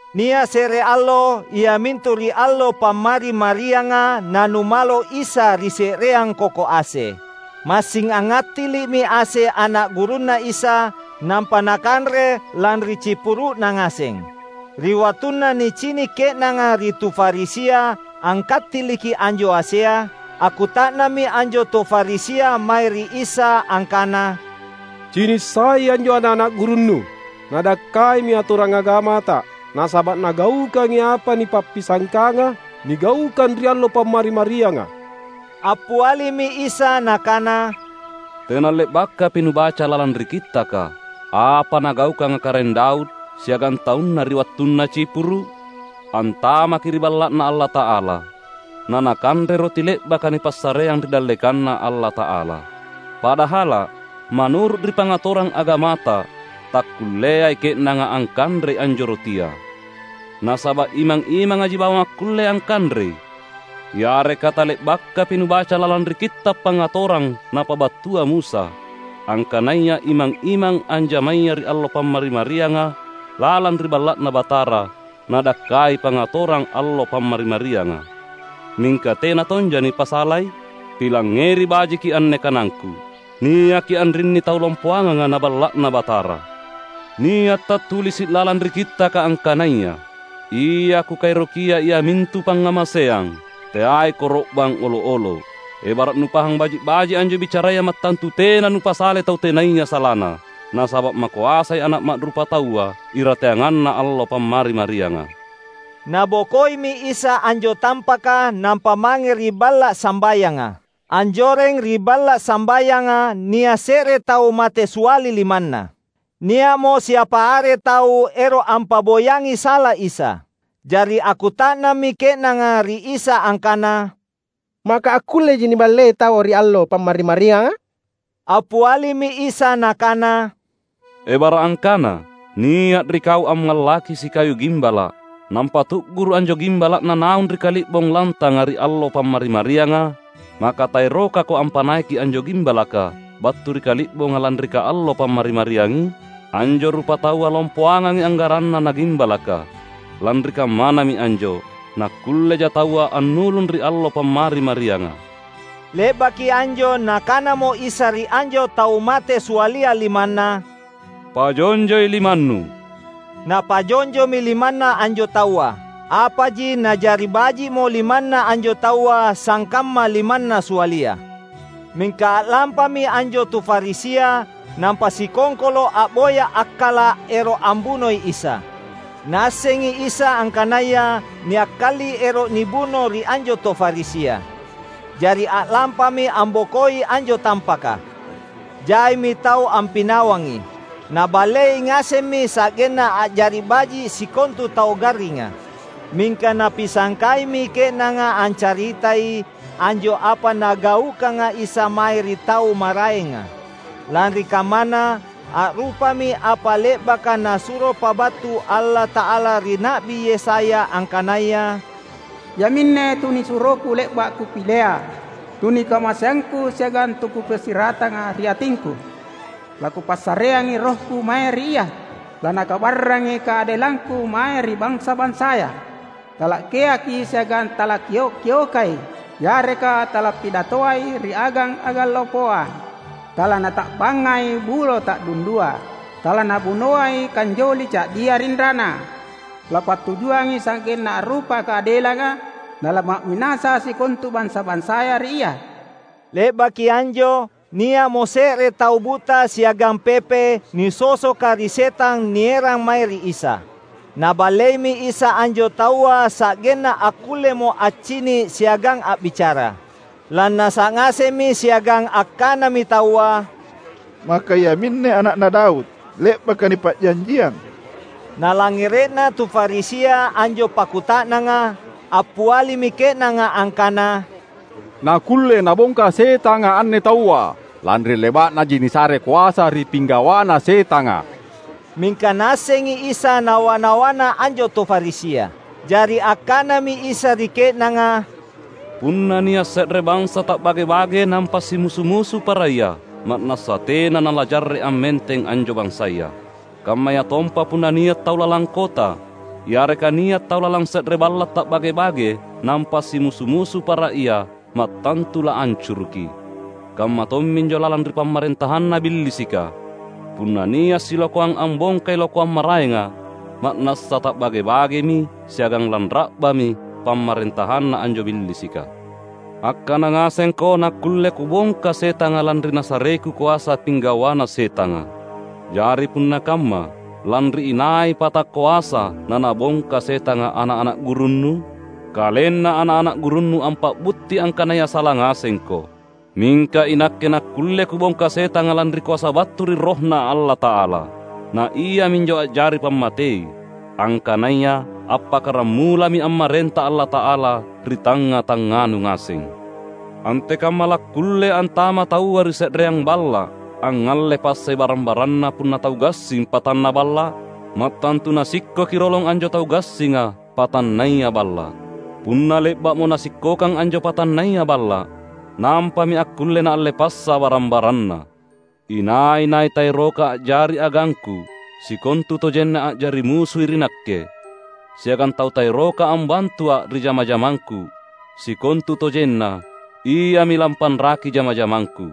Nia’ se’re allo iamintu ri allo Pammari-marianga nanumalo Isa ri se’reang koko ase. Massing angngattili’mi ase ana’ gurunNa Isa nampa nakanre lanri cipuru’na ngaseng. Ri wattunna nicini’ ke’nanga ri tu Farisia angkattiliki anjo asea, akkuta’nammi anjo tu Farisia mae ri Isa angkana, "Cini’ sai anjo ana’-ana’ gurunNu! Nadakkaimi atorang agamata nasaba’ nagaukangi apa nipappisangkanga nigaukang ri allo Pammari-marianga." Appialimi Isa Nakana, "Tena le’bakapi nubaca lalang ri Kittaka, apa nagaukanga Karaeng Daud siagang taunna ri wattunna cipuru’? Antamaki ri Balla’Na Allata’ala, nanakanre roti le’baka nipassareang ri dallekanNa Allata’ala. Padahala’, manuru’ ri pangatorang agamata takkulleai ke’nanga angkanrei anjo rotia — nasaba’ imang-imangaji bawang akkulle angkanrei. Yareka tale’bakapi nubaca lalang ri Kitta’ Pangngatorang napabattua Musa; angkanaya imang-imang anjamaya ri allo Pammari-marianga lalang ri Balla’Na Batara nadakkai pangatorang allo Pammari-marianga, mingka tena tonja nipasalai? Pilangngeri bajiki anne kanangKu: niaki anrinni tau lompoanganga na Balla’Na Batara. Nia’ tattulisi’ lalang ri Kittaka angkanaya: Ia Kukaerokia iamintu pangngamaseang, teai koro’bang olo’-olo’. Ebara’ nupahang baji’-baji’ anjo bicaraya mattantu tena nupasalai tau tenaya salana. Nasaba’ makoasai Ana’ Ma’rupataua irateanganna allo Pammari-marianga." Nabokoimi Isa anjo tampaka nampa mange ri balla’ sambayanga. Anjoreng ri balla’ sambayanga nia’ se’re tau mate siali limanna. Nia’mo siapa are tau ero’ ampa’boyangi sala Isa. Jari akkuta’nammi ke’nanga ri Isa angkana, "Maka akkulleji niballei taua ri allo Pammari-marianga?" Appialimi Isa nakana, "Ebara’ angkana nia’ ri kau ammallaki sikayu gimbala’, nampa tu’guru’ anjo gimbala’na naung ri kali’bong lantanga ri allo Pammari-marianga, maka taerokako ampanaiki anjo gimbalaka battu ri kali’bonga lanri kaallo Pammari-mariangi? Anjo rupataua lompoangangi anggaranna na gimbalaka! Lanri kammanami anjo, nakkulleja taua annulung ri allo Pammari-marianga." Le’baki anjo Nakanamo Isa ri anjo tau mate sialia limanna, "Pajonjoi limannu." Napajonjomi limanna anjo taua; apaji na’jari baji’mo limanna anjo taua sangkamma limanna sialia. Mingka a’lampami anjo tu Farisia, nampa sikongkolo’ a’boya akkala’ ero’ ambunoi Isa. Naassengi Isa angkanaya niakkali ero’ nibuno ri anjo tu Farisia. Jari a’lampami ambokoi anjo tampaka. Jaimi tau ampinawangi. Naballei ngasemmi sa’genna a’jari baji’ sikontu tau garringa. Mingka Napisangkaimi ke’nanga ancaritai anjo apa Nagaukanga Isa mae ri tau maraenga. Lanri kammana, a’rupami apa le’baka Nasuro pabattu Allata’ala ri Na’bi Yesaya angkanaya, "Iaminne TunisuroKu le’ba’ Kupilea, TunikamaseangKu siagang TuKupassiratanga ri atingKu. LaKupassareangi RohKu mae ri Ia, LaNakabarrangi kaadelangKu mae ri bansa-bansaya. Tala’geakai siagang talakkio’-kiokai, yareka talappidatoai ri agang-agang lompoa. TalaNata’bangai bulo ta’dundua TalaNabunoai kanjoli ca’dia rinrana. Lappattujuangi sa’genna a’rupa kaadelanga; nalama’minasa sikontu bansa-bansaya ri Ia." Le’baki anjo, nia’mo se’re tau buta siagang pepe nisosoka ri setang nierang mae ri Isa. Naballeimi Isa anjo taua sa’genna akkullemo accini’ siagang a’bicara. Lannasa’ ngasemmi siagang angkanami taua, "Maka iaminne Ana’na Daud, le’baka nipa’janjiang?" Nalangngere’na tu Farisia anjo pakkuta’nanga, appialimi ke’nanga angkana, "Nakkulle Nabongka setanga anne taua, lanri le’ba’naji nisare koasa ri pinggawana setanga." Mingka Naassengi Isa nawa-nawana anjo tu Farisia. Jari angkanami Isa ri ke’nanga, "Punna nia’ se’re bansa ta’bage-bage nampa simusu-musu para ia, ma’nassa tena nalajarre’ ammenteng anjo bansaya. Kammayatompa punna nia’ tau lalang kota, yareka nia’ tau lalang se’re balla’ ta’bage-bage nampa simusu-musu para ia, mattantu laancuruki. Kamma tomminjo lalang ri pamarentahanna Billisika, punna nia’ silokoang ambongkai lokoang maraenga, ma’nassa ta’bage-bagemi siagang lanra’bami pamarentahanna anjo Billisika. Angkana ngasengko nakkulle Kubongka setanga lanri nasareKu koasa pinggawana setanga. Jari punna kamma, lanri inai pata koasa nanabongka setanga ana’-ana’ gurunnu? Kalenna ana’-ana’ gurunnu ampa’butti angkanaya sala ngasengko! Mingka iNakke nakkulle Kubongka setanga lanri koasa battu ri RohNa Allata’ala. Na iaminjo a’jari pammatei, angkanaya appakkaramulami ammarenta Allata’ala ri tangnga-tangnganu ngaseng. Antekamma lakkulle antama’ taua ri se’reang balla’, angngalle passai barang-baranna punna tau gassing patanna balla’? Mattantu nasikkoki rolong anjo tau gassinga, patannaya balla’. Punna le’ba’mo nasikkokang anjo patannaya balla’, nampami akkulle naalle passa barang-baranna. Inai-nai taeroka a’jari agangKu, sikontutojenna a’jari musui ri Nakke. Siagang tau taeroka ambantuA’ ri jama-jamangKu, sikontutojenna iami lampanraki jama-jamangKu!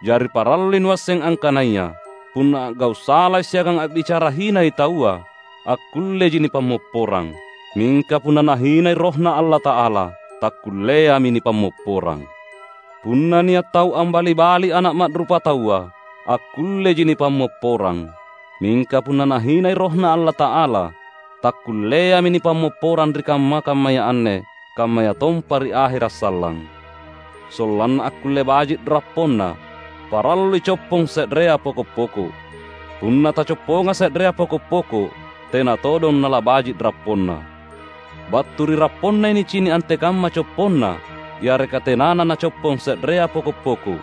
Jari parallui nuasseng angkanaya, punna a’gau’ salai siagang a’bicara hinai taua, akkulleji nipammopporang! Mingka punna nahinai RohNa Allata’ala, takkulleami nipammopporang! Punna nia’ tau ambali-bali Ana’ Ma’rupataua, akkulleji nipammopporang; mingka punna nahinai Rohna Allata’ala, takkulleami nipammopporang ri kamma-kammaya anne kammayatompa ri ahera’ sallang!" "Sollanna akkulle baji’ rapponna, parallui coppong se’rea poko’-poko’. Punna tacopponga se’rea poko’-poko’, tena todong nalabaji’ rapponna. Battu ri rapponnai nicini’ antekamma copponna yareka tenana nacoppong se’rea poko’-poko’.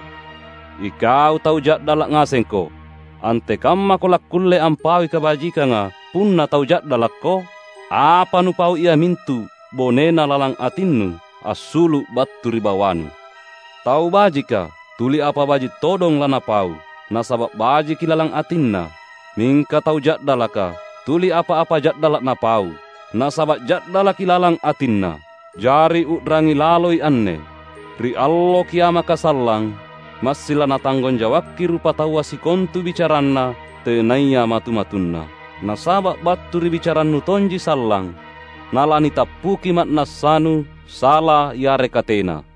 Ikau tau ja’dala’ ngasengko! Antekammako lakkulle ampaui kabajikanga punna tau ja’dalakko? Apa nupau iamintu bonena lalang atinnu, assulu’ battu ri bawanu! Tau bajika, tuli apa baji’ todong lanapau, nasaba’ bajiki lalang atinna. Mingka tau ja’dalaka tuli apa-apa ja’dala’ napau, nasaba’ ja’dalaki lalang atinna. Jari u’rangi laloi anne: ri Allo Kiamaka sallang, massing lanatanggong jawakki rupataua sikontu bicaranna tenaya matu-matunna. Nasaba’ battu ri bicarannu tonji sallang nalanitappuki ma’nassanu sala yareka tena."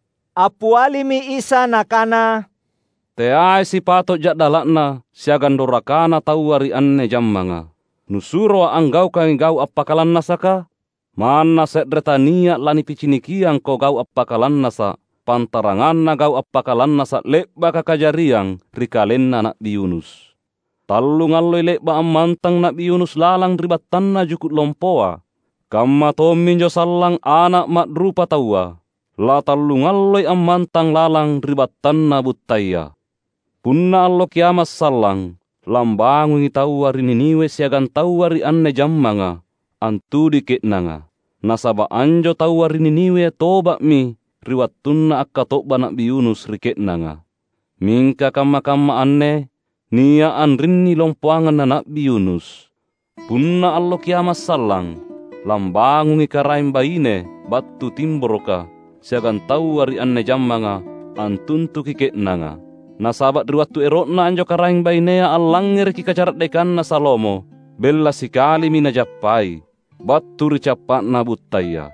Appialimi Isa nakana, "Teai sipato’ ja’dala’na siagang dorakana taua ri anne jammanga. NusuroA’ anggaukangi gau’ appakalannasaka? Manna se’re tania’ lanipicinikiangko gau’ appakalannasa’ pantaranganna gau’ appakalannasa’ le’baka kajariang ri kalenna Na’bi Yunus. Tallungalloi le’ba’ ammantang Na’bi Yunus lalang ri battanna juku’ lompoa. Kamma tomminjo sallang Ana’ Ma’rupataua, latallungalloi ammantang lalang ri battanna buttaya. Punna Allo Kiama’ sallang lambangungi taua ri Niniwe siagang taua ri anne jammanga antudui ke’nanga. Nasaba’ anjo taua ri Niniwe toba’mi ri wattunna akkato’ba Na’bi Yunus ri ke’nanga. Mingka kamma-kamma anne nia’ anrinni lompoangang na Na’bi Yunus! Punna Allo Kiama’ sallang, lambangungi karaeng baine battu Timboroka siagang taua ri anne jammanga antuntuki ke’nanga. Nasaba’ ri wattu ero’na anjo karaeng bainea allangngereki kacara’dekanna Salomo bella sikalimi najappai, battu ri cappa’na buttaya.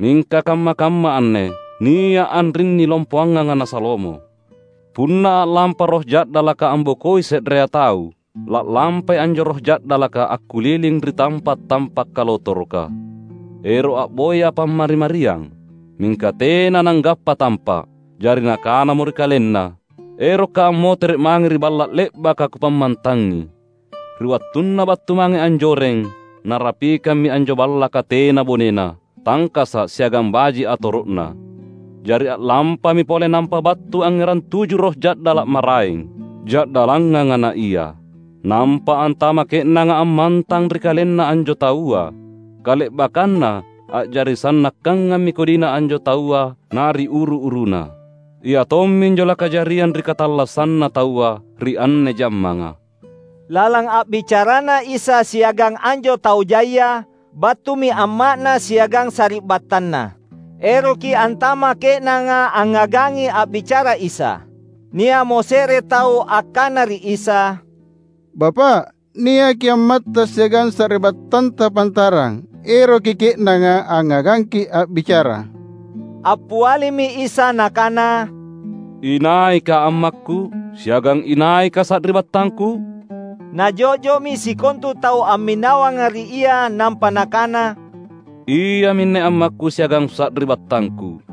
Mingka kamma-kamma anne, nia’ anrinni lompoanganga na Salomo!" "Punna a’lampa roh ja’dalaka ambokoi se’rea tau, la’lampai anjo roh ja’dalaka akkuliling ri tampa’-tampa’ kalotoroka, ero’ a’boya pammari-mariang. Mingka tena nanggappa tampa’. Jari nakanamo ri kalenna, ‘Erokka’ ammotere’ mange ri balla’ le’baka kupammantangi.’ Ri wattunna battu mange anjoreng, narapikammi anjo ballaka tena bonena, tangkasa’ siagang baji’ atoro’na. Jari a’lampami pole nampa battu angngerang tuju roh ja’dala’ maraeng, ja’dallanganga na ia. Nampa antama’ ke’nanga ammantang ri kalenna anjo taua. Kale’bakkanna a’jari sannakkangammi kodina anjo taua na ri uru-uruna. Ia tomminjo lakajariang ri katallassanna taua ri anne jammanga." Lalang a’bicaraNa Isa siagang anjo tau jaia, battumi amma’Na siagang sari’battanNa. Eroki antama’ ke’nanga angngagangi a’bicara Isa. Nia’mo se’re tau angkana ri Isa, "Bapa’, niaki ammatTa siagang sari’battanTa pantarang. Eroki ke’nanga angngagangKi’ a’bicara." Appialimi Isa Nakana, "Inaika ammakKu? Siagang inaika sari’battangKu?" Najo’jo’mi sikontu tau amminawanga ri Ia nampa Nakana, "Iaminne ammakKu siagang sari’battangKu.